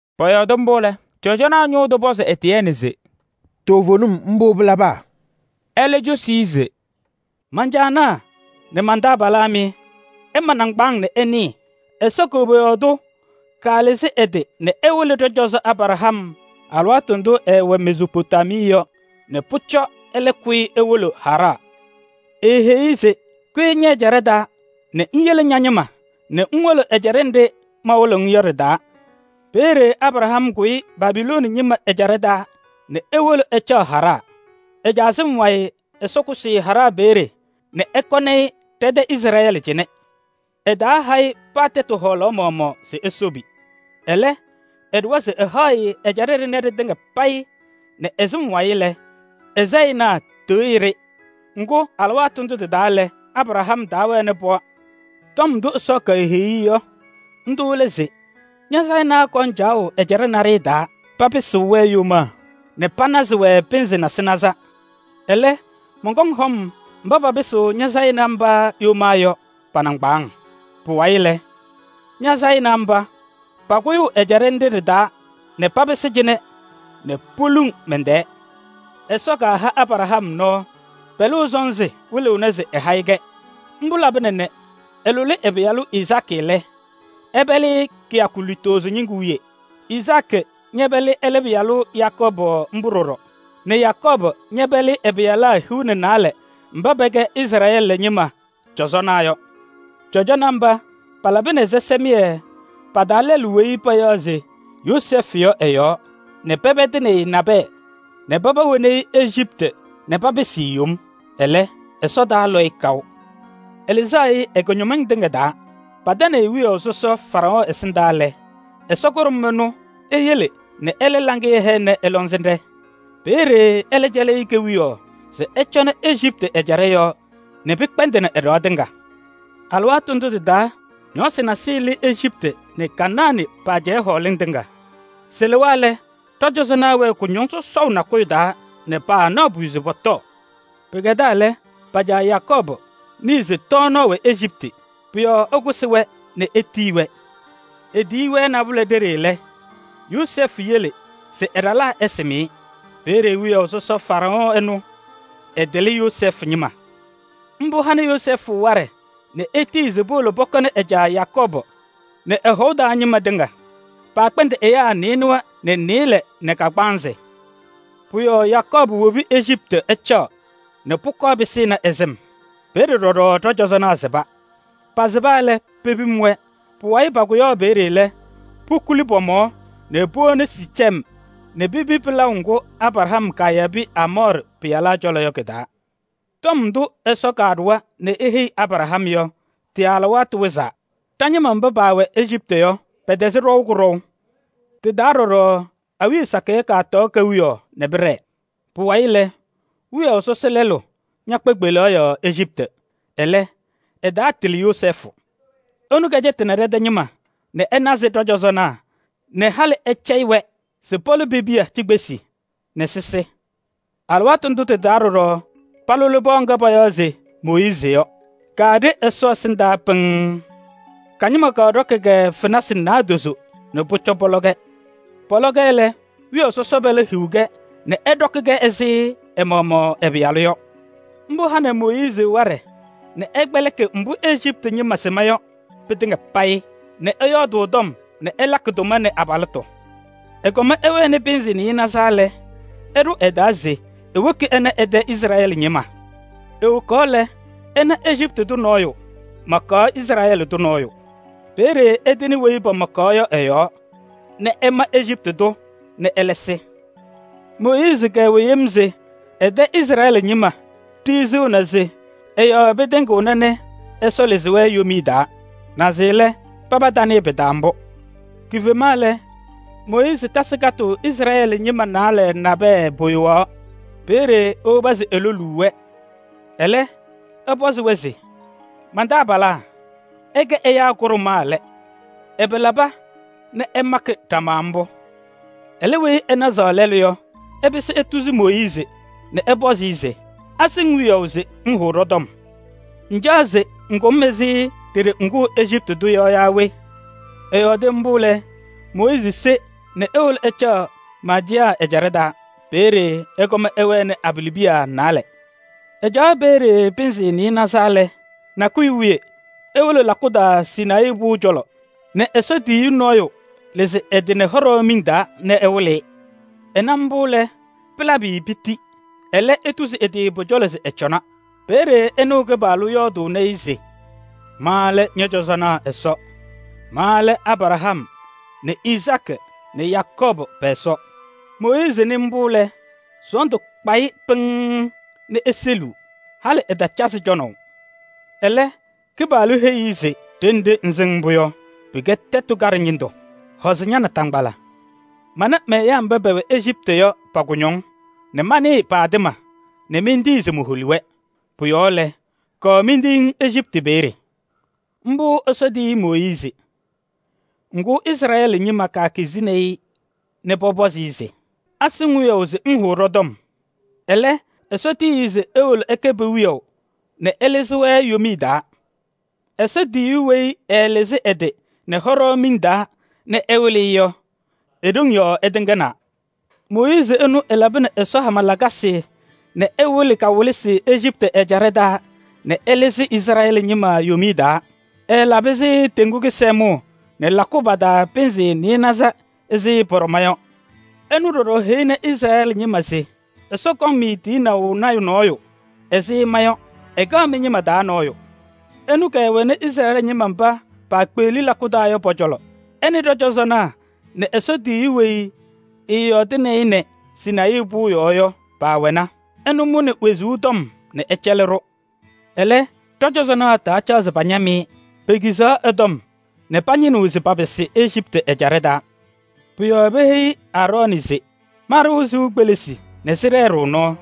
Pɔyɔɔdɩ mbʋ lɛ, cɔjɔnaa ñʋʋ tʋ pɔzɩ Etiyɛɛnɩ se: “Toovenim mbʋ pɩlaba?” Ɛlɛ cosi-i se: “Man-caanaa nɛ man-taabalaa mɩ! Ɩɖʋ nɩŋgbaaŋ nɛ ɩnɩɩ. Ɛsɔ koboyaɣ tʋ kalɩzɩ ɛ-tɩ nɛ ɛwɩlɩ ɖɔ-cɔzɔ Abraham alɩwaatʋ ndʋ ɛɛwɛ Mezoopotamii yɔ nɛ pʋcɔ ɛlɛ kʋyɩ ewolo Haraɣ. Eeheyi-i se: ‘Kʋyɩ ñɛ-ɛjaɖɛ taa nɛ ŋyele ña-ñɩma nɛ ŋwolo ɛjaɖɛ nɖɩ mawɩlɩɣ-ŋ yɔ ɖɩ-taa.’ Peeye Abraham kʋyɩ Calidee ɛjaɖɛ taa nɛ ewolo ɛcaɣ Haraɣ. Ɛ-caa sɩm wayɩ Ɛsɔ kʋsɩ-ɩ Haraɣ peeye nɛ ɛkɔnɩ-ɩ ɖɛ-tɛ Izrɛɛlɩ cɩnɛ. Ɛtaaha-ɩ paa tɛtʋ hɔɔlaɣ maɣmaɣ se esobi. Ɛlɛ, ɛɖʋwa se ɛhaɣ-ɩ ɛjaɖɛ ɖɩnɛ ɖɩtɩŋa payɩ nɛ ɛ-sɩm wayɩ lɛ, ɛ-sayɩnaa tɩɣyɩ-ɖɩ. Ŋgʋ, alɩwaatʋ ndʋ tɩ-taa lɛ, Abraham taawɛnɩ pɩɣa. Tɔm ndʋ Ɛsɔ keheyi-i yɔ, ndʋ lɛ se: ‘Ña-sayɩnaa kɔŋ caɣʋ ɛjaɖɛ naɖɩyɛ taa, papɩsɩɣ-wɛ yomaa nɛ panazɩ-wɛ pɩnzɩ nasɩnaza. Ɛlɛ, mɔnkɔŋ hɔm mba papɩsɩɣ ña-sayɩnaa mba yomaa yɔ pa-nɩŋgbaaŋ. Pʋwayɩ lɛ, ña-sayɩnaa mba, pakʋyʋʋ ɛjaɖɛ nɖɩ ɖɩ-taa nɛ papɩsɩ cɩnɛ nɛ poluŋ mɛn-tɛɛ.’ Ɛsɔ kaha Abraham nɔɔ, pɛlʋʋ sɔnzɩ wɩlɩɣnɩ se ɛha-ɩ-kɛ. Mbʋ labɩna nɛ ɛlʋlɩ ɛ-pɩyalʋ Izaakɩ lɛ, ɛpɛlɩ-ɩ kɩyakʋ lutozo ñɩŋgʋ wiye, Izaakɩ ñɛpɛlɩ ɛlɛ pɩyalʋ Yakɔɔbʋ mbʋ ɖɔɖɔ nɛ Yakɔɔbʋ ñɛpɛlɩ ɛ-pɩyalaa hiu nɛ naalɛ mba pɛkɛ Izrɛɛlɩ ñɩma cɔzɔnaa yɔ. Cɔzɔnaa mba palabɩnɩ ɛzɩsɛmɩyɛ pa-taa lɛlʋ weyi payaɣ se Yozɛɛfʋ yɔ ɛ-yɔɔ nɛ pɛpɛdɩ-ɩ nɛ nabɛyɛ nɛ paba woni-i Ejiptɩ nɛ papɩsɩ-ɩ yom. Ɛlɛ, Ɛsɔ taalɔ-ɩ kaʋ. Ɛlɩzaɣ-ɩ ɛ-kʋñɔmɩŋ tɩŋa taa. Patanɩ-ɩ wiyaʋ sɔsɔ Faraɔɔ ɛsɩndaa lɛ, Ɛsɔ kʋɖʋm ɛnʋ eyele nɛ ɛlɛ laŋɩyɛ hɛnɩ ɛ-lɔŋsɩnɖɛ. Peeye ɛlɛ cɛlɩ-ɩ kewiyaɣ se ɛcɔnɩ Ejiptɩ ɛjaɖɛ yɔɔ nɛ pɩkpɛndɩnɩ ɛ-ɖɩɣa tɩŋa. Alɩwaatʋ ndʋ tɩ-taa ñɔɔsɩ nasɩyɩ lɩ Ejiptɩ nɛ Kanaanɩ pa-ajɛɛ hɔɔlɩŋ tɩŋa. Sɩlɩwa lɛ, ɖɔ-cɔzɔnaa wɛɛ kʋñɔŋ sɔsɔʋ nakʋyʋ taa nɛ paanaɣ pʋyʋ se pɔtɔɔ. Pɩkɛdaa lɛ, pa-caa Yakɔɔbʋ nɩɩ se tɔɔnaɣ wɛ Ejiptɩ. Pʋ-yɔɔ ɛkʋsɩ-wɛ nɛ etiyi-wɛ. Etiyi-wɛ nabʋlɛ ɖeɖe lɛ, Yozɛɛfʋ yele se ɛ-ɖalaa ɛsɩm-ɩ. Peeye wiyaʋ sɔsɔ Faraɔɔ ɛnʋ, ɛtɩlɩ Yozɛɛfʋ ñɩma. Mbʋ hanɩ Yozɛɛfʋ waɖɛ nɛ etiyi se powolo pɔkɔnɩ ɛ-caa Yakɔɔbʋ nɛ ɛ-hɔʋ taa ñɩma tɩŋa. Paakpɛndɩ ɛyaa nɩɩnʋwa nɛ nɩɩlɛ nɛ kagbaanzɩ. Pʋ-yɔɔ Yakɔɔbʋ wobi Ejiptɩ ɛcaɣ nɛ pʋkɔɔ pɩsɩnɩ ɛ-sɩm. Peeye ɖɔɖɔ ɖɔ-cɔzɔnaa sɩba. Pasɩba lɛ, pepim-wɛ. Pʋwayɩ pakʋyaɣ peeye lɛ, pokuli pɔ-mɔɔ nɛ powoni Siicem nɛ pepi pɩlaʋ ŋgʋ Abraham kayabɩ Aamɔɔrɩ pɩyalaa cɔlɔ yɔ kɩ-taa. Tɔm ndʋ Ɛsɔ kaɖʋwa nɛ eheyi Abraham yɔ, tɩ-alɩwaatʋ wɩzaa lɛ, ɖa-ñɩma mba paawɛ Ejiptɩ yɔ, pɛtɛzɩɣ ɖɔʋ kʋɖɔʋ. Tɩ-taa ɖɔɖɔ awiya sakɩyɛ kɔtɔɔ kewiyaɣ nɛ pɩɖɛɛ. Pʋwayɩ lɛ, wiyaʋ sɔsɔ lɛɛlʋ ñakpa kpelaɣ yɔɔ Ejiptɩ. Ɛlɛ, ɛtaatɩlɩ Yozɛɛfʋ. Ɛnʋ kɛcɛtɩnɩ ɖɛ-tɛ ñɩma nɛ ɛnazɩ ɖɔ-cɔzɔnaa nɛ halɩ ɛcɛyɩ-wɛ se pɔlɔ pe-piya cikpesi nɛ sɩsɩ. Alɩwaatʋ ndʋ tɩ-taa ɖɔɖɔ palʋlɩ pɩɣa ŋga payaɣ se Mooyiizi yɔ, kaaɖe Ɛsɔ ɛsɩndaa pɩŋŋ. Ka-ñɩma kɔɖɔkɩ-kɛ fenasɩ naadozo nɛ pʋcɔ pɔlɔ-kɛ. Pɔlɔ-kɛ lɛ, wiyaʋ sɔsɔ pɛlɛ hii-kɛ nɛ ɛɖɔkɩ-kɛ ɛzɩ ɛ-maɣmaɣ ɛ-pɩyalʋ yɔ. Mbʋ hanɩ Mooyiizi waɖɛ nɛ ɛkpɛlɩkɩ mbʋ Ejiptɩ ñɩma sɩma yɔ pɩtɩŋa payɩ nɛ ɛyɔɔdʋʋ tɔm nɛ ɛlakɩ tʋma nɛ abalɩtʋ. Ɛkɔm ɛwɛnɩ pɩnzɩ nɩɩnaza lɛ, ɛɖʋ ɛ-taa se ewoki ɛna ɛ-tɛ Izrɛɛlɩ ñɩma. Ewokaɣ lɛ, ɛna Ejiptɩ tʋ nɔɔyʋ makaɣ Izrɛɛlɩ tʋ nɔɔyʋ. Peeye ɛtɩnɩ weyi pamakaɣ-ɩ yɔ ɛ-yɔɔ nɛ ɛma Ejiptɩ tʋ nɛ ɛlɛ sɩ. Mooyiizi kɛwɛ yem se ɛ-tɛ Izrɛɛlɩ ñɩma ɖiɣzinaa se ɛ-yɔɔ pɩtɩŋɩɣna nɛ Ɛsɔ lɩzɩ-wɛ yomiye taa. Naze lɛ, paba tanɩɩ pɩ-taa mbʋ. Kifema lɛ, Mooyiizi tasɩ katʋʋ Izrɛɛlɩ ñɩma naalɛ nabɛyɛ, poyowaɣ. Peeye ewobi se eloluu-wɛ, ɛlɛ ɛpɔzɩ-wɛ se: ‘Man-taabalaa! Ɩkɛ ɛyaa kʋɖʋmaa lɛ, ɛbɛ laba nɛ ɩmakɩ ɖama mbʋ?’ Ɛlɛ weyi ɛnazaɣ lɛlʋ yɔ, ɛpɩsɩ etuzi Mooyiizi nɛ ɛpɔzɩ-ɩ se: ‘Asɩ-ŋ wiyaʋ se ŋhʋʋ ɖɔ-tɔm? Ŋcaɣ se ŋkʋ-m ɛzɩ ɖeɖe ŋkʋʋ Ejiptɩ tʋ yɔ yaa we?’ Ɛyɔɔdɩ mbʋ lɛ, Mooyiizi se nɛ ewolo ɛcaɣ Maadiyaɣ ɛjaɖɛ taa. Peeye ɛkɔm ɛwɛnɩ abalɩbiya naalɛ. Ɛcaɣ peeye pɩnzɩ nɩɩnaza lɛ, nakʋyʋ wiye ewolo lakʋ taa Sinayii pʋʋ cɔlɔ nɛ Ɛsɔ tiyiyu nɔɔyʋ lɩzɩ ɛ-tɩ nɛ hɔɖaɣ miŋ taa nɛ ɛwɩlɩ-ɩ. Ɛna mbʋ lɛ, pɩlabɩ-ɩ piti. Ɛlɛ etuzi ɛ-tɩ pʋ-cɔlɔ se ɛcɔna. Peeye ɛnɩɣ Kɩpaɣlʋ yɔɔdʋʋnɩ-ɩ se: ‘Ma lɛ ñɔ-cɔzɔnaa Ɛsɔ. Ma lɛ Abraham nɛ Izaakɩ nɛ Yakɔɔbʋ pɛ-Ɛsɔ.’ Mooyiizi nɩ mbʋ lɛ, sɔɔndʋ kpa-ɩ pɩŋŋ nɛ eseliɣ, halɩ ɛtacazɩ cɔnaʋ. Ɛlɛ Kɩpaɣlʋ heyi-i se: ‘Ɖenɖe ŋsɩŋ mbʋ yɔ, pɩkɛ tɛtʋ kaɖɛ ñɩndʋ. Hɔzɩ ña-naataŋgbala. Mana mɛ-ɛyaa mba pɛwɛ Ejiptɩ yɔ pa-kʋñɔŋ nɛ manɩɩ pa-atɩma nɛ mentii se moholi-wɛ. Pʋ-yɔɔ lɛ, kɔɔ mentiyi-ŋ Ejiptɩ peeye.’ Mbʋ Ɛsɔ tiyi Mooyiizi. Ŋgʋ, Izrɛɛlɩ ñɩma kekizi-i nɛ pɔpɔzɩ-ɩ se: ‘Asɩ-ŋ wiyaʋ se ŋhʋʋ ɖɔ-tɔm?’ Ɛlɛ, Ɛsɔ tiyi-i se ewolo ɛkɛ pe-wiyaʋ nɛ ɛlɩzɩ-wɛ yomiye taa. Ɛsɔ tiyiyu weyi ɛɛlɩzɩ ɛ-tɩ nɛ hɔɖaɣ miŋ taa nɛ ɛwɩlɩ-ɩ yɔ, e-ɖoŋ yɔɔ ɛtɩŋnaa. Mooyiizi ɛnʋ ɛlabɩnɩ Ɛsɔ hama lakasɩ nɛ ɛwɩlɩ kawɩlɩsɩ Ejiptɩ ɛjaɖɛ taa nɛ ɛlɩzɩ Izrɛɛlɩ ñɩma yomiye taa. Ɛɛlabɩ-sɩ Teŋgu Kɩsɛmʋʋ nɛ lakʋ pa-taa pɩnzɩ nɩɩnaza nzɩ pɔɖɔma yɔ. Ɛnʋ ɖɔɖɔ heyini Izrɛɛlɩ ñɩma se: ‘Ɛsɔ kɔŋ-mɩ tiyinaʋ lɔɔyaɣ tʋ nɔɔyʋ ɛzɩ ma yɔ, ɛkɛɣ mɩ-ñɩma taa nɔɔyʋ.’ Ɛnʋ kɛwɛnɩ Izrɛɛlɩ ñɩma mba paakpeɣli lakʋ taa yɔ pɔ-cɔlɔ: ɛ nɛ ɖɔ-cɔzɔnaa nɛ Ɛsɔ tiyiyu weyi ɛyɔɔdaɣnɩ-ɩ nɛ Sinayii pʋʋ yɔɔ yɔ paawɛna. Ɛnʋ mʋnɩ wezuu tɔm nɛ ɛcɛlɩ-ɖʋ. Ɛlɛ, ɖɔ-cɔzɔnaa taacaɣ se pañam-ɩ. Pekizaɣ ɛ-tɔm nɛ pañɩnɩɣ se papɩsɩ Ejiptɩ ɛjaɖɛ taa. Pʋ-yɔɔ peheyi Aarɔɔnɩ se: ‘Ma-ɖʋ sɩʋ kpelisi nɛ sɩɖɛɛ-ɖʋ nɔɔ.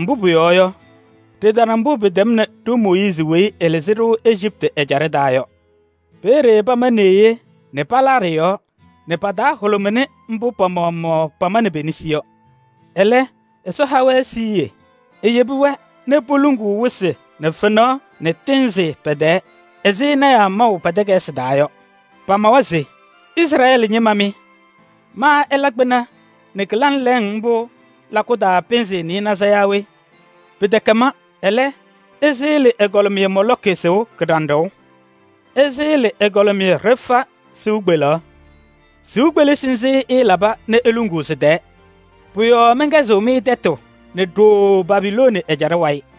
Mbʋ pʋyɔɔ yɔ, ɖɩtana mbʋ pɩtɛmnɩ ɖo-Mooyiizi weyi ɛlɩzɩ-ɖʋ Ejiptɩ ɛjaɖɛ taa yɔ.’ Peeye pama neɣye nɛ palaa ɖɩ-yɔɔ nɛ pa-taa hʋlʋmɩnɩ mbʋ pa-maɣmaɣ pamanɩ pe-nesi yɔ. Ɛlɛ, Ɛsɔ ha-wɛ siɣye. Eyebi-wɛ nɛ poluŋ wɩsɩ nɛ fenaɣ nɛ tɩɩnzɩ pɛ-tɛɛ ɛzɩ lɔɔyɩsɩ tɩnaa maʋ pa-takayɩsɩ taa yɔ. Pamawa se: ‘Izrɛɛlɩ ñɩma mɩ! Ma ɩla kpɩna nɛ kɩlaŋ lɛɛŋ mbʋ lakʋ taa pɩnzɩ nɩɩnaza yaa we? Pɩtɛkɛ ma. Ɛlɛ, ɩsɩɣlɩ ɛgɔlɩmɩyɛ Moolɔkɩ kɩɖanɖʋʋ nɛ ɛgɔlɩmɩyɛ Refaɣ sɩʋ kpeleɣ. Sɩʋ kpelisi nzɩ ɩɩlaba nɛ iluŋuu sɩ-tɛɛ! Pʋ-yɔɔ mɛnkɛzɩɣ-mɩ tɛtʋ nɛ ɖooo Babilooni ɛjaɖɛ wayɩ!’”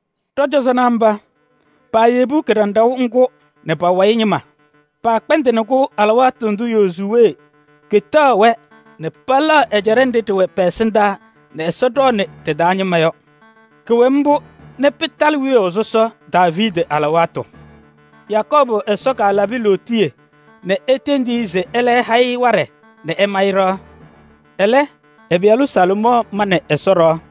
Ɖɔ-cɔzɔnaa mba, paayebi kɩɖanɖʋʋ ŋgʋ nɛ pa-wayɩ ñɩma. Paakpɛndɩnɩ-kʋ alɩwaatʋ ndʋ Yozuwee ketaɣ-wɛ nɛ pɛlɛɣ ɛjaɖɛ nɖɩ ɖɩwɛ pɛ-ɛsɩndaa nɛ Ɛsɔ ɖɔɔnɩ ɖɩ-taa ñɩma yɔ. Kʋwɛ mbʋ nɛ pɩtalɩ wiyaʋ sɔsɔ Daaviidi alɩwaatʋ. Yakɔɔbʋ Ɛsɔ kalabɩ-ɩ lootiye nɛ etendi-i se ɛlɛ ɛha-ɩ waɖɛ nɛ ɛma-ɩ ɖɩɣa. Ɛlɛ, ɛ-pɩyalʋ Salomɔɔ manɩ Ɛsɔ ɖɩɣa.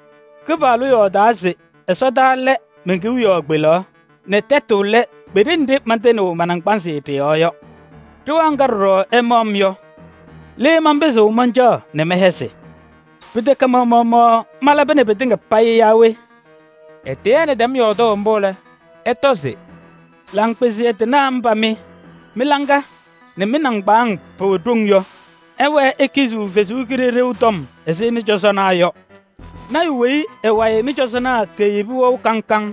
‘Kɩpaɣlʋ yɔɔdaa se ɛsɔtɔnʋʋ lɛ men-kewiyaɣ kpelaɣ nɛ tɛtʋ lɛ kpeɖe nɖɩ mantɩnɩɣ ma-naŋgbanzɩ ɖɩ-yɔɔ yɔ. Ɖɩɣa ŋga ɖɔɖɔ ɩmaɣ-m yɔ? Le manpɩzɩɣ mancaɣ nɛ mɛhɛzɩ? Pɩtɛkɛ ma-maɣmaɣ malabɩnɩ pɩtɩŋa payɩ yaa we?’” Etiyɛɛnɩ tɛm yɔɔdʋʋ mbʋ lɛ, ɛtɔ se: “Laŋkpɩzɩyɛ tɩnaa mba mɩ mɩ-laŋa nɛ mɩ-nɩŋgbaaŋ pɛwɛ ɖoŋ yɔ! Ɩwɛɛ ikiziɣ Ɛsɔ Kalɩzaɣ tɔm ɛzɩ mɩ-cɔzɔnaa yɔ! Lɔɔyaɣ tʋ weyi ɛ-wayɩ mɩ-cɔzɔnaa keyebi wɛʋ kaŋ kaŋ?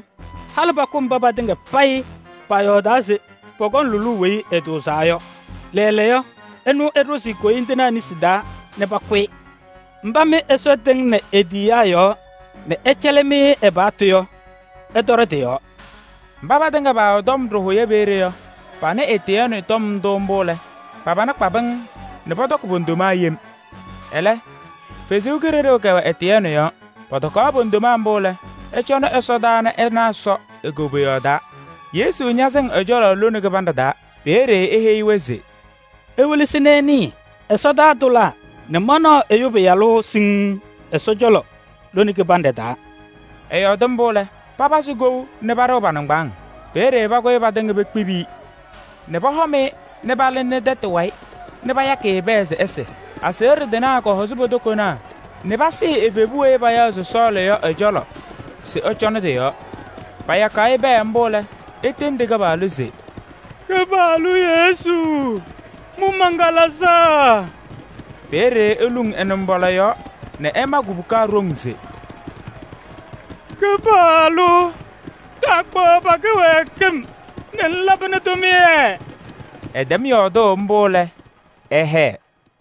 Halɩ pakʋ mba patɩŋa payɩ paayɔɔdaa se pɔkɔŋ lʋlʋʋ Weyi Ɛtʋʋzaa yɔ. Lɛɛlɛɛyɔ, ɛnʋ ɩɖʋzɩ koyindinaa nesi taa nɛ pakʋ-ɩ. Mba mɩ Ɛsɔ tɩŋnɩ e-tiyiyaa yɔɔ nɛ ɛcɛlɩ-mɩ ɛ-paɣtʋ yɔ, ɩtɔɖɔ tɩ-yɔɔ!” Mba patɩŋa paawɛ tɔm ɖɩhʋyɛ peeye yɔ, panɩ Etiyɛɛnɩ tɔm ndʋ mbʋ lɛ, pa-pana kpa pɩŋŋ nɛ pɔtɔkɩ po-ndoma yem. Ɛlɛ, Ɛsɔ Kalɩzaɣ kɛwɛ Etiyɛɛnɩ yɔɔ. Pɔtɔkaɣ po-ndoma mbʋ lɛ, ɛcɔnɩ ɛsɔdaa nɛ ɛna Ɛsɔ e-koboyaɣ taa, Yesu ñasɩŋ ɛ-cɔlɔ lone kɩbanɖɛ taa. Peeye eheyi-wɛ se: “Iwelesi nɛ ɩnɩɩ: ɛsɔtɔnʋʋ tʋlaa nɛ manaɣ Ɛyʋ Pɩyalʋ sɩŋ Ɛsɔ cɔlɔ lone kɩbanɖɛ taa.” Ɛyɔɔdɩ mbʋ lɛ, papazɩ kou nɛ paɖɩɣ pa-nɩŋgbaaŋ! Peeye pakʋyɩ patɩŋa pekpibi-i nɛ pɔhɔm-ɩ nɛ palɩnɩ tɛtʋ wayɩ nɛ payakɩ-ɩ pɛɛ se ɛsɩ. Aseɣɖe tɩnaa kɔhɔzɩ po-tokonaa nɛ pasɩɩ evebu weyi payaɣ se Sɔɔlɩ yɔ ɛ-cɔlɔ se ɛcɔnɩ tɩ-yɔɔ. Payakaɣ-ɩ pɛɛ mbʋ lɛ, etendi Kɩpaɣlʋ se: “Kɩpaɣlʋ Yesu! Mʋ man-kalɩzaɣ!” Peeye eluŋ ɛ-nɩmbɔla yɔɔ nɛ ɛma kubuka ɖoŋ se: “Kɩpaɣlʋ! Taakpaɣ pa-kɩwɛɛkɩm nɛ ŋlabɩnɩ tʋmɩyɛ!” Ɛtɛm yɔɔdʋʋ mbʋ lɛ, ɛhɛɛ.